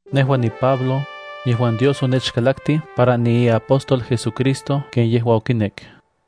Nejua niPablo, yejuan Dios onechkalaktij para niiapóstol JesuCristo ken yejua okinek.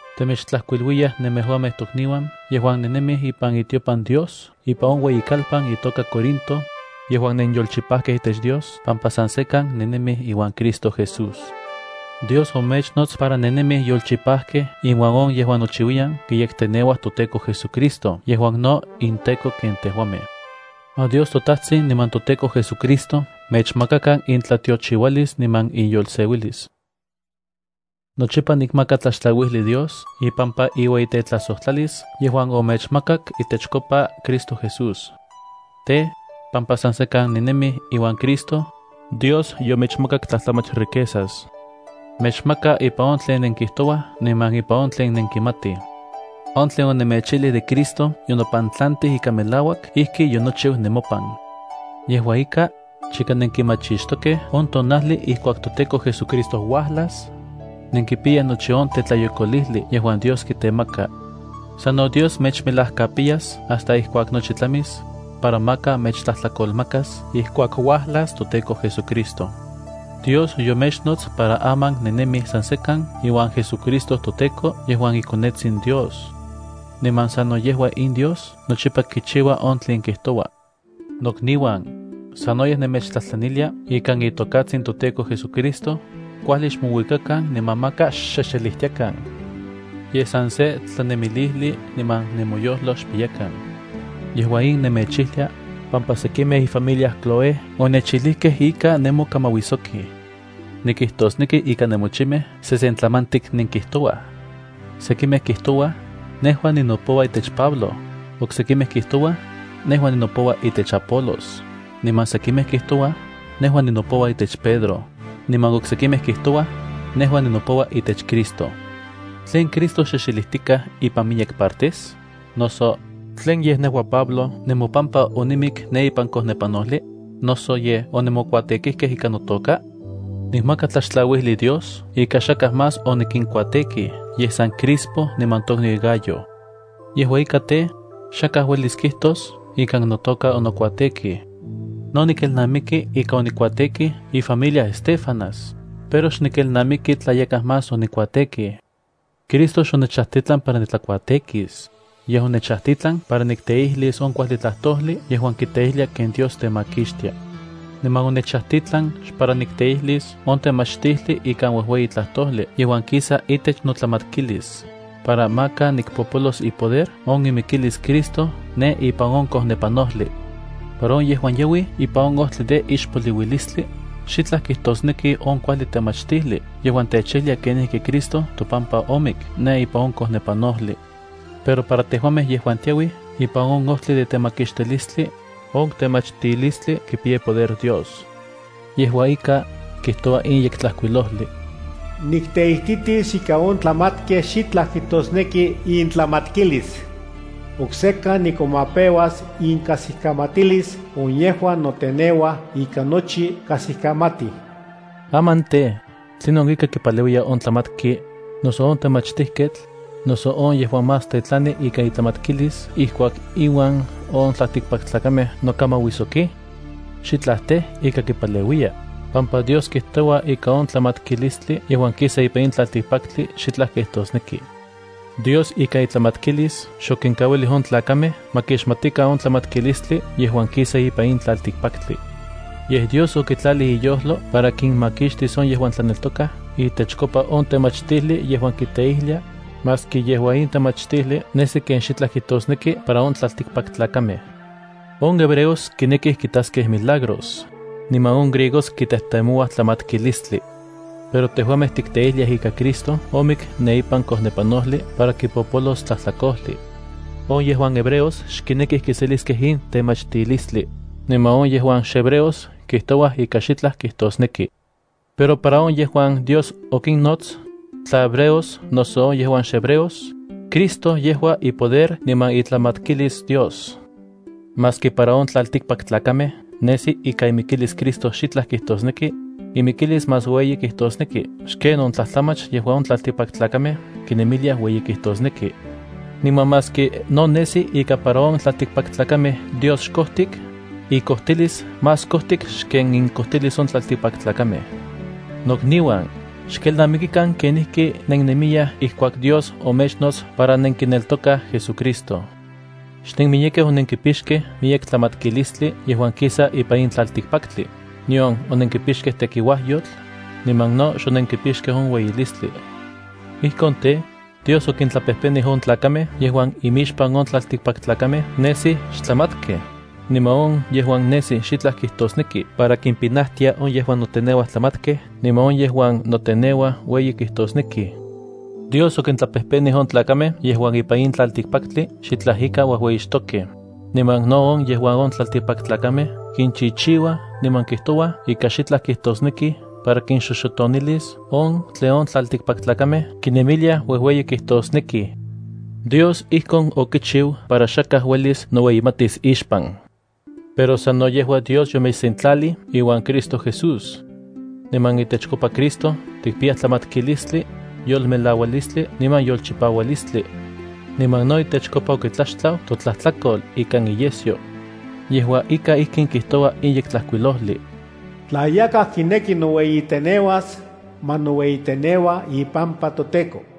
temechtlajkuiluiyaj nemejuamej tokniuan yejuan nennemij ipan itiopan Dios ompa ipan on ueyikalpan itoka Corinto, yejuan nenyolchipajkej itech Dios pampa san sekan nennemij iuan Cristo Jesús. Dios omechnots para nennemij yolchipajkej inuan on yejuan nochiuiyan kiyekteneuaj toTEKO JesuCristo yejuan no inTEKO ken tejuamej. Ma Dios toTajtsin niman toTEKO JesuCristo mechmakakan intlatiochiualis niman inyolseuilis. Nochipa nikmaka tlaxtlauijli Dios ipampa iueyitejtlajsojtlalis yejuan omechmakak itechkopa Cristo Jesús. Tej, pampa san sekan nennemij iuan Cristo, Dios yomechmakak tlajtlamach riquezas. Mechmaka ipan on tlen nenkijtouaj niman ipan on tlen nenkimatij. On tlen onemechijlij de Cristo yonopantlantij ika melauak ijki yonochiu nemopan. Yejua ika, chika nenkimachixtokej on tonajli ijkuak toTEKO JesuCristo uajlas, nenkipiyaj nochi on tetlayokolijli yejuan Dios kitemaka. Sano Dios mechmelajkapiyas hasta ijkuak nochi tlamis, para maka mechtlajtlakolmakas ijkuak uajlas toTEKO JesuCristo. Dios yomechnots para aman nenenemij san sekan iuan JesuCristo toTEKO yejuan iKonetsin Dios. Niman sano yejua in Dios nochipa kichiua on tlen kijtoua. Nokniuan, sanoyej nemechtlajtlanilia ikan itokatsin toTEKO JesuCristo, kuajli xmouikakan niman maka xxexelijtiakan. Yej san se tlanemilijli niman nemoyojlo xpiyakan. Yejua in nemechijlia, pampa sekimej ifamilia Cloé onechijlijkej ika nenmokamauijsokij. Nikijtosneki ika nemochimej sesentlamantik nenkijtouaj. Sekimej kijtouaj: “Nejua ninopoua itech Pablo”, oksekimej kijtouaj: “Nejua ninopoua itech Apolos”, niman sekimej kijtouaj: “Nejua ninopoua itech Pedro”, niman oksekimej kijtouaj: “Nejua ninopoua itech Cristo.” ¿Tlen Cristo xexelijtikaj ipan miyek partes? Noso, ¿tlin yej nejua Pablo nemopampa onimik ne ipan kojnepanojli? ¿Noso yej onemokuatekijkej ikan notoka? Nikmaka tlaxtlauijli Dios ika xakaj más onikinkuatekij yej san Crispo niman tokniu Gayo. Yejua ika tej, xakaj uelis kijtos ikan notoka onokuatekij. No nikelnamiki ika no onikuatekij ifamilia Estéfanas, pero xnikelnamiki tla yakaj más onikuatekij. Cristo xonechajtitlan para nitlakuatekis, yej onechajtitlan para nikteijlis on kuajli tlajtojli yejuan kiteijlia ken Dios temakixtia. Niman onechajtitlan xpara nikteijlis on temachtijli ikan uejueyi tlajtojli yejuan kisa itech notlamatkilis para maka nikpopolos ipoder on imikilis Cristo ne ipan on kojnepanojli. Para on yejuan yauij ipan on ojtli de ixpoliuilistli, xitlaj kijtosneki on kuajli temachtijli yejuan techijlia kenijki Cristo topampa omik ne ipan on kojnepanojli. Pero para tejuamej yejuan tiauij ipan on ojtli de temakixtilistli, on temachtilistli kipiya ipoder Dios. Yejua ika, kijtoua in Yektlajkuilojli: Nikteititis ika on tlamatkej xitlaj kijtosneki intlamatkilis. Oksekan nikomapeuas inkajsikamatilis on yejuan noteneuaj ika nochi kajsikamatij. Aman tej, ¿tlinon ika kipaleuiya on tlamatki, noso on temachtijketl, noso on yejuan más tetlani ikan itlamatkilis ijkuak inuan on tlaltikpaktlakamej nokamauisoki? Xitlaj tej, ika kipaleuiya, pampa Dios kijtoua ika on tlamatkilistli yejuan kisa ipan in tlaltikpaktli xitlaj kijtosneki. Dios ikan itlamatkilis xokinkauilij on tlakamej ma kixmatikan on tlamatkilistli yejuan kisa ipan in tlaltikpaktli. Yej Dios okitlalij iyojlo para kinmakixtis on yejuan tlaneltokaj itechkopa on temachtijli yejuan tikteijliaj, maski yejua in temachtijli nesi ken xitlaj kijtosneki para on tlaltikpaktlakamej. On hebreos kinekij kitaskej milagros, niman on griegos kitejtemouaj tlamatkilistli. Pero tejuamej tikteijliaj ika Cristo omik ne ipan kojnepanojli para kipopolos tlajtlakojli. On yejuan hebreos xkinekij kiseliskej in temachtilistli, niman on yejuan xhebreos kijtouaj ika xitlaj kijtosneki. Pero para on yejuan Dios okinnots, tla hebreos noso on yejuan xhebreos, Cristo yejua ipoder niman itlamatkilis Dios. Maski para on tlaltikpaktlakamej nesi ika imikilis Cristo xitlaj kijtosneki, imikilis más ueyi kijtosneki xken on tlajtlamach yejuan on tlaltikpaktlakamej kinemiliaj ueyi kijtosneki. Niman maski no nesi ika para on tlaltikpaktlakamej Dios xkojtik, ikojtilis más kojtik xken inkojtilis on tlaltikpaktlakamej. Nokniuan, xkelnamikikan kenijki nennemiyaj ijkuak Dios omechnots para nenkineltokaj JesuCristo. Xnenmiyekej onenkipixkej miyek tlamatkilistli yejuan kistika ipan in tlaltikpaktli, nion onenkipixkej tekiuajyotl, niman no xonenkipixkej on ueyilistli. Ijkon tej, Dios okintlapejpenij on tlakamej yejuan imixpan on tlaltikpaktlakamej nesij xtlamatkej, niman on yejuan nesij xitlaj kijtosnekij para kimpinajtiaj on yejuan noteneuaj tlamatkej niman on yejuan noteneuaj ueyi kijtosnekij. Dios okintlapejpenij on tlakamej yejuan ipan in tlaltikpaktli xitlaj ika uejueyixtokej, niman no on yejuan on tlaltikpaktlakamej kinchichiuaj niman kijtouaj ika xitlaj kijtosnekij para kinxoxotonilis on tlen on tlaltikpaktlakamej kinemiliaj uejueyi kijtosnekij. Dios ijkon okichiu para xakaj uelis noueyimatis ixpan. Pero sano yejua Dios yomechsentlalij iuan Cristo Jesús. Niman itechkopa Cristo tikpiyaj tlamatkilistli, yolmelaualistli niman yolchipaualistli. Niman no itechkopa okitlaxtlau totlajtlakol ikan iyesyo. Yejua ika ijkin kijtoua in Yektlajkuilojli: “Tla yakaj kineki noueyiteneuas, ma noueyiteneua ipampa toTEKO.”